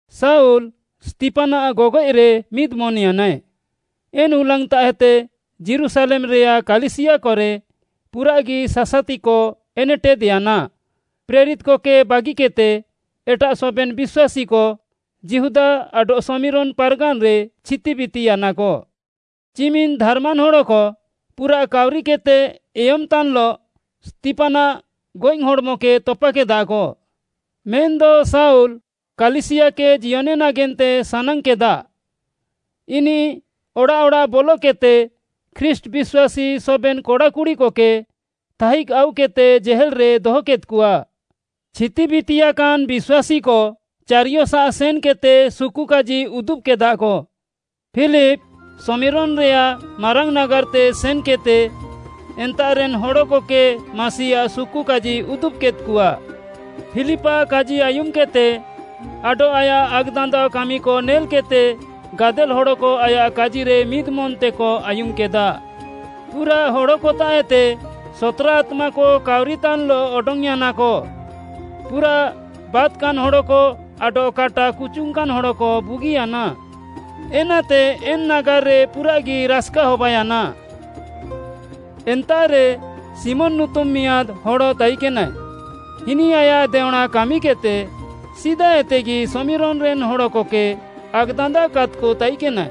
ଶାଉଲ୍‌ ସ୍ତିଫାନ୍‌ଆଃ ଗଗଏଃରେ ମିଦ୍‌ମନ୍‌ୟାନାଏ। ଏନ୍‌ ହୁଲାଙ୍ଗ୍‌ତାଃଏତେ ଯୀରୁଶାଲେମ୍‌ରେୟାଃ କାଲିସିୟାକରେ ପୁରାଃଗି ସାସାତିକ ଏନେଟେଦ୍‌ୟାନା। ପ୍ରେରିତ୍‌କକେ ବାଗିକେଦ୍‌ତେ ଏଟାଃ ସବେନ୍‌ ବିଶ୍ୱାସୀକ ଯିହୁଦା ଆଡଃ ଶମିରୋନ୍‌ ପାର୍‌ଗାନ୍‌ରେ ଛିତିବିତିୟାନାକ। ଚିମିନ୍‌ ଧାର୍‌ମାନ୍‌ ହଡ଼କ ପୁରାଃ କାଉରିକେଦ୍‌ତେ ଏୟମ୍‌ତାନ୍‌ଲଃ ସ୍ତିଫାନ୍‌ଆଃ ଗଏଃ ହଡ଼୍‌ମକେ ତପାକେଦାକ। ମେନ୍‌ଦ ଶାଉଲ୍‌ କାଲିସିୟାକେ ଜିୟନେ ନାଗେନ୍ତେ ସାନାଙ୍ଗ୍‌କେଦା, ଇନିଃ ଅଡ଼ାଃ ଅଡ଼ାଃ ବଲକେଦ୍‌ତେ ଖ୍ରୀଷ୍ଟ୍‌ ବିଶ୍ୱାସୀ ସବେନ୍‌ କଡ଼ା କୁଡ଼ିକକେ ଥାଇଜ୍‌ ଆଉକେଦ୍‌ତେ ଜେହେଲ୍‌ରେ ଦହକେଦ୍‌କଆ। ଛିତିବିତିୟାକାନ୍‌ ବିଶ୍ୱାସୀକ ଚାରିୟସାଃ ସେନ୍‌କେଦ୍‌ତେ ସୁକୁକାଜି ଉଦୁବ୍‍କେଦାକ। ଫିଲିପ୍‌ ଶମିରୋନ୍‌ରେୟାଃ ମାରାଙ୍ଗ୍‌ ନାଗାର୍‌ତେ ସେନ୍‌କେଦ୍‌ତେ, ଏନ୍ତାଃରେନ୍‌ ହଡ଼କକେ ମାସିଆଃ ସୁକୁକାଜି ଉଦୁବ୍‌କେଦ୍‌କଆ। ଫିଲିପ୍‌ଆଃ କାଜି ଆୟୁମ୍‌କେଦ୍‌ତେ ଆଡଃ ଆୟାଃ ଆକ୍‌ଦାନ୍ଦାଅ କାମିକ ନେଲ୍‌କେଦ୍‌ତେ ଗାଦେଲ୍‌ ହଡ଼କ ଆୟାଃ କାଜିରେ ମିଦ୍‌ମନ୍‌ତେକ ଆୟୁମ୍‌କେଦା। ପୁରାଃ ହଡ଼କତାଃଏତେ ସତ୍‌ରା ଆତ୍ମାକ କାଉରିତାନ୍‌ଲଃ ଅଡଙ୍ଗ୍‌ୟାନାକ, ପୁରାଃ ବାତ୍‌କାନ୍‌ ହଡ଼କ ଆଡଃ କାଟା କୁଚୁଙ୍ଗ୍‌କାନ୍‌ ହଡ଼କ ବୁଗିୟାନା। ଏନାତେ ଏନ୍‌ ନାଗାର୍‌ରେ ପୁରାଃଗି ରାସ୍‌କା ହବାୟାନା। ଏନ୍ତାଃରେ ଶିମୋନ୍‌ ନୁତୁମ୍‌ ମିଆଁଦ୍‌ ହଡ଼ ତାଇକେନାଏ, ଇନିଃ ଆୟାଃ ଦେଅଁଣା କାମିକେଦ୍‌ତେ ସିଦାଏତେଗି ଶମିରୋନ୍‌ରେନ୍‌ ହଡ଼କକେ ଆକ୍‌ଦାନ୍ଦାଅକାଦ୍‌କ ତାଇକେନାଏ।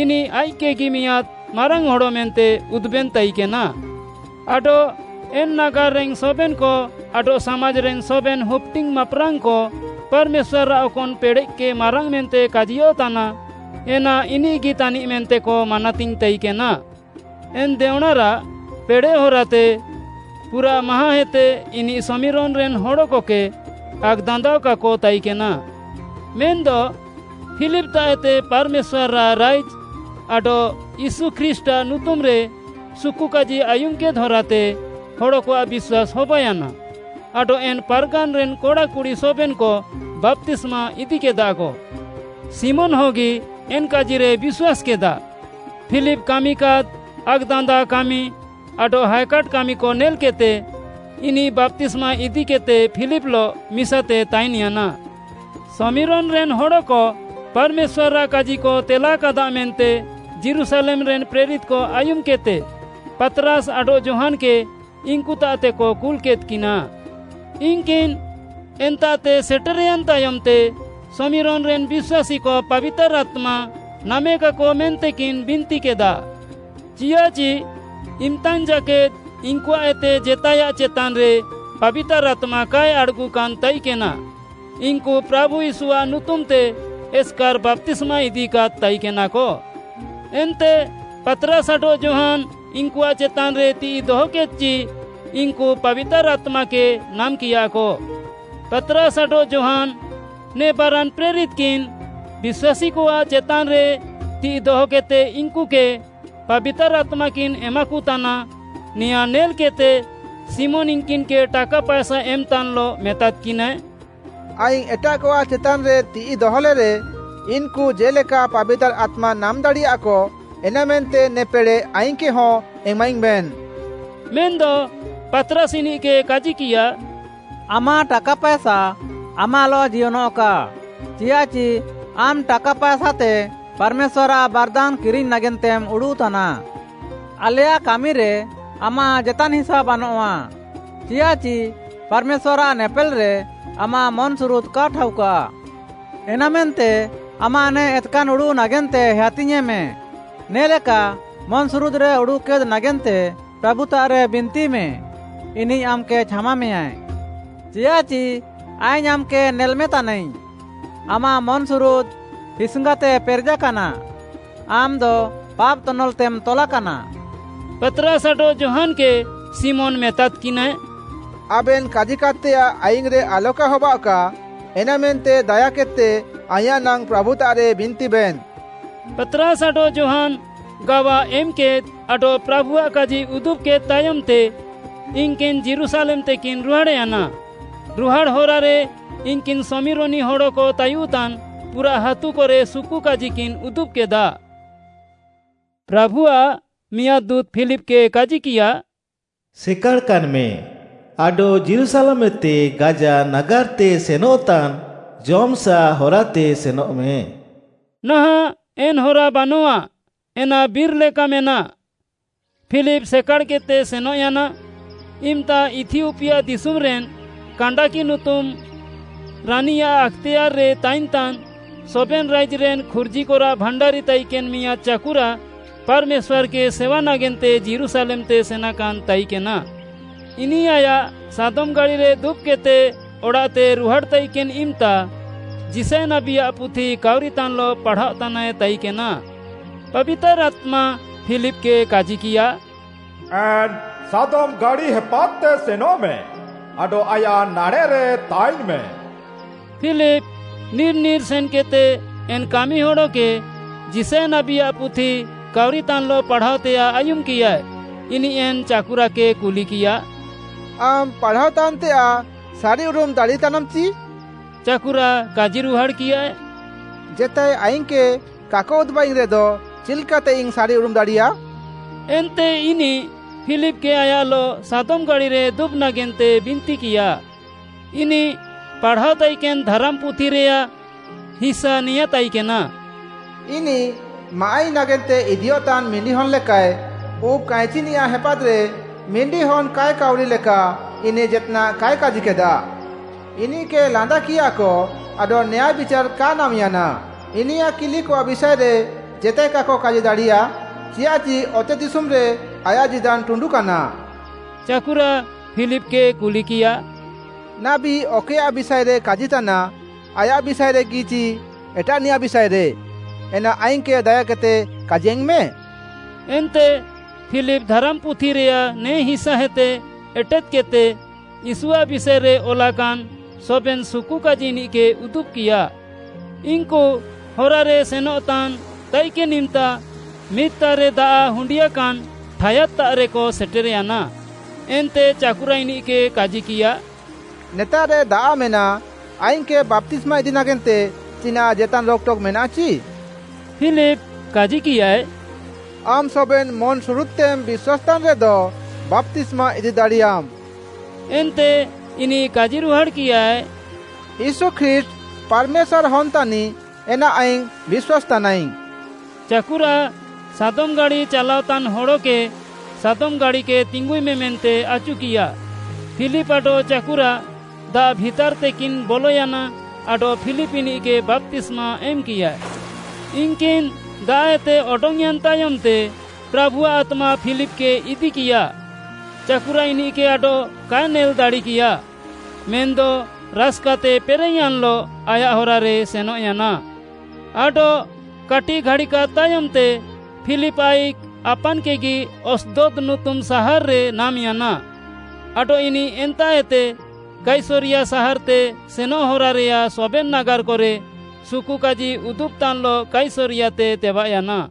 ଇନିଃ ଆଇଃକ୍‌କେଗି ମିଆଁଦ୍‌ ମାରାଙ୍ଗ୍‌ ହଡ଼ ମେନ୍ତେ ଉଦୁବେନ୍‌ ତାଇକେନା, ଆଡଃ ଏନ୍‌ ନାଗାର୍‌ରେନ୍‌ ସବେନ୍‌କ ଆଡଃ ସାମାଜ୍‌ରେନ୍‌ ସବେନ୍‌ ହୁପ୍‌ଡିଙ୍ଗ୍‌ ମାପ୍‌ରାଙ୍ଗ୍‌କ, ପାର୍‌ମେଶ୍ୱାର୍‌ଆଃ ଅକନ୍‌ ପେଡ଼େଃକେ ମାରାଙ୍ଗ୍‌ ମେନ୍ତେ କାଜିୟଃତାନା, ଏନା ଇନିଃଗି ତାନିଃ ମେନ୍ତେକ ମାନାତିଙ୍ଗ୍‌ ତାଇକେନା। ଏନ୍‌ ଦେଅଁଣାରାଃ ପେଡ଼େଃ ହରାତେ ପୁରାଃ ମାହାଁଁଏତେ ଇନିଃ ଶମିରୋନ୍‌ରେନ୍‌ ହଡ଼କକେ ଆକ୍‌ଦାନ୍ଦାଅକାକ ତାଇକେନା। ମେନ୍‌ଦ ଫିଲିପ୍‌ତାଃଏତେ ପାର୍‌ମେଶ୍ୱାର୍‌ଆଃ ରାଇଜ୍‌ ଆଡଃ ୟୀଶୁ ଖ୍ରୀଷ୍ଟ୍‌ଆଃ ନୁତୁମ୍‌ରେ ସୁକୁକାଜି ଆୟୁମ୍‌କେଦ୍‌ ହରାତେ ହଡ଼କଆଃ ବିଶ୍ୱାସ୍‌ ହବାୟାନା ଆଡଃ ଏନ୍‌ ପାର୍‌ଗାନ୍‌ରେନ୍ କଡ଼ା କୁଡ଼ି ସବେନ୍‌କ ବାପ୍ତିସ୍ମା ଇଦିକେଦାକ। ଶିମୋନ୍‌ ହଗି ଏନ୍‌ କାଜିରେ ବିଶ୍ୱାସ୍‌କେଦା। ଫିଲିପ୍‌ କାମିକାଦ୍‌ ଆକ୍‌ଦାନ୍ଦାଅ କାମି ଆଡଃ ହାଏକାଟ୍‌ କାମିକ ନେଲ୍‌କେଦ୍‌ତେ, ଇନିଃ ବାପ୍ତିସ୍ମା ଇଦିକେଦ୍‌ତେ ଫିଲିପ୍‌ଲଃ ମିସାତେ ତାଇନ୍‌ୟାନା। ଶମିରୋନ୍‌ରେନ୍‌ ହଡ଼କ ପାର୍‌ମେଶ୍ୱାର୍‌ଆଃ କାଜିକ ତେଲାକାଦା ମେନ୍ତେ ଯୀରୁଶାଲେମ୍‌ରେନ୍‌ ପ୍ରେରିତ୍‌କ ଆୟୁମ୍‌କେଦ୍‌ତେ, ପାତ୍‌ରାସ୍‌ ଆଡଃ ଯୋହାନ୍‌କେ ଇନ୍‌କୁତାଃତେକ କୁଲ୍‌କେଦ୍‌କିନା। ଇନ୍‌କିନ୍‌ ଏନ୍ତାଃତେ ସେଟେର୍‌ୟାନ୍‌ ତାୟମ୍‌ତେ ଶମିରୋନ୍‌ରେନ୍‌ ବିଶ୍ୱାସୀକ ପାବିତାର୍‌ ଆତ୍ମା ନାମେକାକ ମେନ୍ତେକିନ୍ ବିନ୍ତିକେଦା। ଚିୟାଃଚି ଇମ୍‌ତାଙ୍ଗ୍‌ ଜାକେଦ୍‌ ଇନ୍‌କୁଆଃଏତେ ଜେତାଏୟାଃ ଚେତାନ୍‌ରେ ପାବିତାର୍‌ ଆତ୍ମା କାଏ ଆଡ଼୍‌ଗୁକାନ୍‌ ତାଇକେନା। ଇନ୍‌କୁ ପ୍ରାଭୁ ୟୀଶୁଆଃ ନୁତୁମ୍‌ତେ ଏସ୍‌କାର୍‌ ବାପ୍ତିସ୍ମା ଇଦିକାଦ୍‌ ତାଇକେନାକ। ଏନ୍ତେ ପାତ୍‌ରାସ୍‌ ଆଡଃ ଯୋହାନ୍‌ ଇନ୍‌କୁଆଃ ଚେତାନ୍‌ରେ ତିଃଇ ଦହକେଦ୍‌ଚି ଇନ୍‌କୁ ପାବିତାର୍‌ ଆତ୍ମାକେ ନାମ୍‌କିୟାକ। ପାତ୍‌ରାସ୍‌ ଆଡଃ ଯୋହାନ୍‌, ନେ ବାରାନ୍‌ ପ୍ରେରିତ୍‌କିନ୍‌ ବିଶ୍ୱାସୀକଆଃ ଚେତାନ୍‌ରେ ତିଃଇ ଦହକେଦ୍‌ତେ ଇନ୍‌କୁକେ ପାବିତାର୍‌ ଆତ୍ମାକିନ୍‌ ଏମାକତାନା, ନେୟାଁ ନେଲ୍‌କେଦ୍‌ତେ ଶିମୋନ୍‌ ଇନ୍‌କିନ୍‌କେ ଟାକା ପାଏସା ଏମ୍‌ତାନ୍‌ଲଃ ମେତାଦ୍‌କିନାଏ, “ଆଇଙ୍ଗ୍‌ ଏଟାଃକଆଃ ଚେତାନ୍‌ରେ ତିଃଇ ଦହଲେରେ, ଇନ୍‌କୁ ଜେ'ଲେକା ପାବିତାର୍‌ ଆତ୍ମା ନାମ୍‌ ଦାଡ଼ିୟାକ, ଏନାମେନ୍ତେ ନେ ପେଡ଼େଃ ଆଇଙ୍ଗ୍‌କେହଁ ଏମାଇଙ୍ଗ୍‌ବେନ୍‌।” ମେନ୍‌ଦ ପାତ୍‌ରାସ୍‌ ଇନିଃକେ କାଜିକିୟା, “ଆମାଃ ଟାକା ପାଏସା ଆମାଃଲଃ ଜିୟନଃକା, ଚିୟାଃଚି ଆମ୍‌ ଟାକା ପାଏସାତେ ପାର୍‌ମେଶ୍ୱାର୍‌ଆଃ ବାର୍‌ଦାନ୍‌ କିରିଙ୍ଗ୍‌ ନାଗେନ୍ତେମ୍‌ ଉଡ଼ୁଃତାନା। ଆଲେୟାଃ କାମିରେ ଆମାଃ ଜେତାନ୍‌ ହିସା ବାନଆଃ, ଚିୟାଃଚି ପାର୍‌ମେଶ୍ୱାର୍‌ଆଃ ନେପେଲ୍‌ରେ ଆମାଃ ମନ୍‌ସୁରୁଦ୍‌ କା ଠାଉକା। ଏନାମେନ୍ତେ ଆମାଃ ନେ ଏତ୍‍କାନ୍‌ ଉଡ଼ୁଃ ନାଗେନ୍ତେ ହେୟାତିଙ୍ଗ୍‌ମେ, ନେ'ଲେକା ମନ୍‌ସୁରୁଦ୍‌ରେ ଉଡ଼ୁଃକେଦ୍‌ ନାଗେନ୍ତେ ପ୍ରାଭୁତାଃରେ ବିନ୍ତିମେ, ଇନିଃ ଆମ୍‌କେ ଛାମାମେୟାଁ। ଚିୟାଃଚି ଆଇଙ୍ଗ୍‌ ଆମ୍‌କେ ନେଲ୍‌ମେ ତାନାଇଙ୍ଗ୍‌, ଆମାଃ ମନ୍‌ସୁରୁଦ୍‌ ହିସ୍‌ଙ୍ଗାତେ ପେରେଜାକାନା, ଆମ୍‌ଦ ପାପ୍‌ ତନଲ୍‌ତେମ୍‌ ତଲାକାନା।” ପାତ୍‌ରାସ୍‌ ଆଡଃ ଯୋହାନ୍‌କେ ଶିମୋନ୍‌ ମେତାଦ୍‌କିନାଏ, “ଆବେନ୍‌ କାଜିକାଦ୍‌ତେୟାଃ ଆଇଙ୍ଗ୍‌ରେ ଆଲକା ହବାଅଃକା, ଏନାମେନ୍ତେ ଦାୟାକେଦ୍‌ତେ ଆଇଁୟାଃ ନାଙ୍ଗ୍‌ ପ୍ରାଭୁତାଃରେ ବିନ୍ତିବେନ୍‌।” ପାତ୍‌ରାସ୍‌ ଆଡଃ ଯୋହାନ୍‌ ଗାୱା ଏମ୍‌କେଦ୍‌ ଆଡଃ ପ୍ରାଭୁଆଃ କାଜି ଉଦୁବ୍‌କେଦ୍‌ ତାୟମ୍‌ତେ, ଇନ୍‌କିନ୍‌ ଯୀରୁଶାଲେମ୍‌ତେକିନ୍‌ ରୁହାଡ଼୍‌ୟାନା। ରୁହାଡ଼୍‌ ହରାରେ ଇନ୍‌କିନ୍‌ ଶମିରୋନି ହଡ଼କ ତାୟୁଃତାନ୍‌ ପୁରାଃ ହାତୁକରେ ସୁକୁକାଜିକିନ୍‌ ଉଦୁବ୍‌କେଦା। ପ୍ରାଭୁଆଃ ମିଆଁଦ୍‌ ଦୁଁତ୍‌ ଫିଲିପ୍‌କେ କାଜିକିୟା, “ସେକାଡ଼ାକାନ୍‌ମେ, ଆଡଃ ଯୀରୁଶାଲେମ୍‌ଏତେ ଗାଜା ନାଗାର୍‌ତେ ସେନଃତାନ୍‌ ଜମ୍‌ସାଃ ହରାତେ ସେନଃମେ।” ନାହାଁଃ ଏନ୍‌ ହରା ବାନଆଃ, ଏନା ବିର୍‌ ଲେକା ମେନାଃ। ଫିଲିପ୍‌ ସେକାଡ଼୍‌କେଦ୍‌ତେ ସେନଃୟାନା। ଇମ୍‌ତା ଇଥିଓପିଆ ଦିଶୁମ୍‌ରେନ୍‌ କାଣ୍ଡାକି ନୁତୁମ୍‌ ରାନୀଆଃ ଆକ୍‌ତେୟାର୍‌ରେ ତାଇନ୍‌ତାନ୍‌ ସବେନ୍‌ ରାଇଜ୍‌ରେନ୍‌ ଖୁର୍ଜିକରାଃ ଭାଣ୍ଡାରି ତାଇକେନ୍‌ ମିଆଁଦ୍‌ ଚାକୁରା, ପାର୍‌ମେଶ୍ୱାର୍‌କେ ସେୱା ନାଗେନ୍ତେ ଯୀରୁଶାଲେମ୍‌ତେ ସେନାକାନ୍‌ ତାଇକେନା। ଇନିଃ ଆୟାଃ ସାଦମ୍‌ ଗାଡ଼ିରେ ଦୁବ୍‌କେଦ୍‌ତେ ଅଡ଼ାଃତେ ରୁହାଡ଼୍‌ ତାଇକେନ୍‌ ଇମ୍‌ତା ଯିଶାୟ ନାବୀଆଃ ପୁଥି କାଉରିତାନ୍‌ଲଃ ପାଢ଼ାଅତାନାଏ ତାଇକେନା। ପାବିତାର୍‌ ଆତ୍ମା ଫିଲିପ୍‌କେ କାଜିକିୟା, “ଏନ୍‌ ସାଦମ୍‌ ଗାଡ଼ି ହେପାଦ୍‌ତେ ସେନଃମେ ଆଡଃ ଆୟାଃ ନାଡ଼େଃରେ ତାଇନ୍‌ମେ।” ଫିଲିପ୍‌ ନିର୍‌ ନିର୍‌ ସେନ୍‌କେଦ୍‌ତେ ଏନ୍‌ କାମିହଡ଼କେ ଯିଶାୟ ନାବୀଆଃ ପୁଥି କାଉରିତାନ୍‌ଲଃ ପାଢ଼ାଅତେୟାଃ ଆୟୁମ୍‌କିୟାଏ। ଇନିଃ ଏନ୍‌ ଚାକୁରାକେ କୁଲିକିୟା, “ଆମ୍‌ ପାଢ଼ାଅତାନ୍‌ତେୟାଃ ସାରିଉରୁମ୍‌ ଦାଡ଼ିତାନାମ୍‌ ଚି?” ଚାକୁରା କାଜିରୁହାଡ଼୍‌କିୟାଏ, “ଜେତାଏ ଆଇଙ୍ଗ୍‌କେ କାକ ଉଦୁବାଇଙ୍ଗ୍‌ରେଦ ଚିଲ୍‌କାତେଇଙ୍ଗ୍‌ ସାରିଉରୁମ୍‌ ଦାଡ଼ିୟା?” ଏନ୍ତେ ଇନିଃ ଫିଲିପ୍‌କେ ଆୟାଃଲଃ ସାଦମ୍‌ ଗାଡ଼ିରେ ଦୁବ୍‌ ନାଗେନ୍ତେ ବିନ୍ତିକିୟା। ଇନିଃ ପାଢ଼ାଅ ତାଇକେନ୍‌ ଧାରାମ୍‌ପୁଥିରେୟାଃ ହିସା ନେୟାଁ ତାଇକେନା, “ଇନିଃ, ମାଆଃଇ ନାଗେନ୍ତେ ଇଦିୟଃତାନ୍ ମିଣ୍ଡିହନ୍‍ ଲେକାଃଏ, ଉବ୍‌ କାଇଁଚିନିୟାଃ ହେପାଦ୍‌ରେ ମିଣ୍ଡିହନ୍‌ କାଏ କାଉରି ଲେକା ଇନିଃ ଜେତ୍‌ନାଃ କାଏ କାଜିକେଦା। ଇନିଃକେ ଲାନ୍ଦାକିୟାକ ଆଡଃ ନ୍ୟାୟ ବିଚାର୍‌ କା ନାମ୍‌ୟାନା। ଇନିୟାଃ କିଲିକଆଃ ବିଷାଏରେ ଜେତାଏ କାକ କାଜି ଦାଡ଼ିୟା, ଚିୟାଃଚି ଅତେଦିଶୁମ୍‌ରେ ଆୟାଃ ଜୀଦାନ୍‌ ଟୁଣ୍ଡୁକାନା।” ଚାକୁରା ଫିଲିପ୍‌କେ କୁଲିକିୟା, “ନାବୀ ଅକଏୟାଃ ବିଷାଏରେ କାଜିତାନା, ଆୟାଃ ବିଷାଏରେଗି ଚି ଏଟାଃନିୟାଃ ବିଷାଏରେ, ଏନା ଆଇଙ୍ଗ୍‌କେ ଦାୟାକେଦ୍‌ତେ କାଜିଙ୍ଗ୍‌ମେ?” ଏନ୍ତେ ଫିଲିପ୍‌ ଧାରାମ୍‌ପୁଥିରେୟାଃ ନେ ହିସାଏତେ ଏଟେଦ୍‌କେଦ୍‌ତେ ୟୀଶୁଆଃ ବିଷାଏରେ ଅଲାକାନ୍‌ ସବେନ୍‌ ସୁକୁକାଜି ଇନିଃକେ ଉଦୁବ୍‌କିୟା। ଇନ୍‌କୁ ହରାରେ ସେନଃତାନ୍‌ ତାଇକେନ୍‌ ଇମ୍‌ତା ମିଦ୍‌ତାଃରେ ଦାଆଃ ହୁଣ୍ଡିୟାକାନ୍‌ ଠାୟାଦ୍‌ତାଃରେକ ସେଟେର୍‌ୟାନା, ଏନ୍ତେ ଚାକୁରା ଇନିଃକେ କାଜିକିୟା, “ନେତାଃରେ ଦାଆଃ ମେନାଃ, ଆଇଙ୍ଗ୍‌କେ ବାପ୍ତିସ୍ମା ଇଦି ନାଗେନ୍ତେ ଚିନାଃ ଜେତାନ୍‌ ରୋକ୍‌ଟକ୍‌ ମେନାଃ ଚି?” ଫିଲିପ୍‌ କାଜିକିୟାଏ, “ଆମ୍‌ ସବେନ୍‌ ମନ୍‌ସୁରଦ୍‌ତେମ୍‌ ବିଶ୍ୱାସ୍‌ତାନ୍‌ରେଦ ବାପ୍ତିସ୍ମା ଇଦି ଦାଡ଼ିୟାମ୍‌।” ଏନ୍ତେ ଇନିଃ କାଜିରୁହାଡ଼୍‌କିୟାଏ, “ୟୀଶୁ ଖ୍ରୀଷ୍ଟ୍‌ ପାର୍‌ମେଶ୍ୱାର୍‌ଆଃ ହନ୍‌ ତାନିଃ ଏନା ଆଇଙ୍ଗ୍‌ ବିଶ୍ୱାସ୍‌ତାନାଇଙ୍ଗ୍‌।” ଚାକୁରା, ସାଦମ୍‌ ଗାଡ଼ି ଚାଲାଅତାନ୍‌ ହଡ଼କେ ସାଦମ୍‌ ଗାଡ଼ିକେ ତିଙ୍ଗୁଇମେ ମେନ୍ତେ ଆଚୁକିୟା। ଫିଲିପ୍‌ ଆଡଃ ଚାକୁରା ଦାଆଃ ଭିତାର୍‌ତେକିନ୍‌ ବଲୟାନା ଆଡଃ ଫିଲିପ୍ ଇନିଃକେ ବାପ୍ତିସ୍ମା ଏମ୍‌କିୟାଏ। ଇନ୍‌କିନ୍‌ ଦାଆଃଏତେ ଅଡଙ୍ଗ୍‌ୟାନ୍‌ ତାୟମ୍‌ତେ, ପ୍ରାଭୁଆଃ ଆତ୍ମା ଫିଲିପ୍‌କେ ଇଦିକିୟା। ଚାକୁରା ଇନିଃକେ ଆଡଃ କାଏ ନେଲ୍‌ ଦାଡ଼ିକିୟା, ମେନ୍‌ଦ ରାସ୍‍କାତେ ପେରେଃୟାନ୍‌ଲଃ ଆୟାଃ ହରାରେ ସେନଃୟାନା। ଆଡଃ କାଟିଃ ଘାଡ଼ିକାଦ୍‌ ତାୟମ୍‌ତେ ଫିଲିପ୍‌ ଆଇଃକ୍‌ ଆପାନ୍‌କେଗି ଆସ୍‌ଦଦ୍‌ ନୁତୁମ୍‌ ସାହାର୍‌ରେ ନାମ୍‌ୟାନା ଆଡଃ ଇନିଃ ଏନ୍ତାଃଏତେ କାଇସରିୟା ସାହାର୍‌ତେ ସେନଃ ହରାରେୟାଃ ସବେନ୍‌ ନାଗାର୍‌କରେ ସୁକୁକାଜି ଉଦୁବ୍‌ତାନ୍‌ଲଃ କାଇସରିୟାତେ ତେବାଃୟାନା।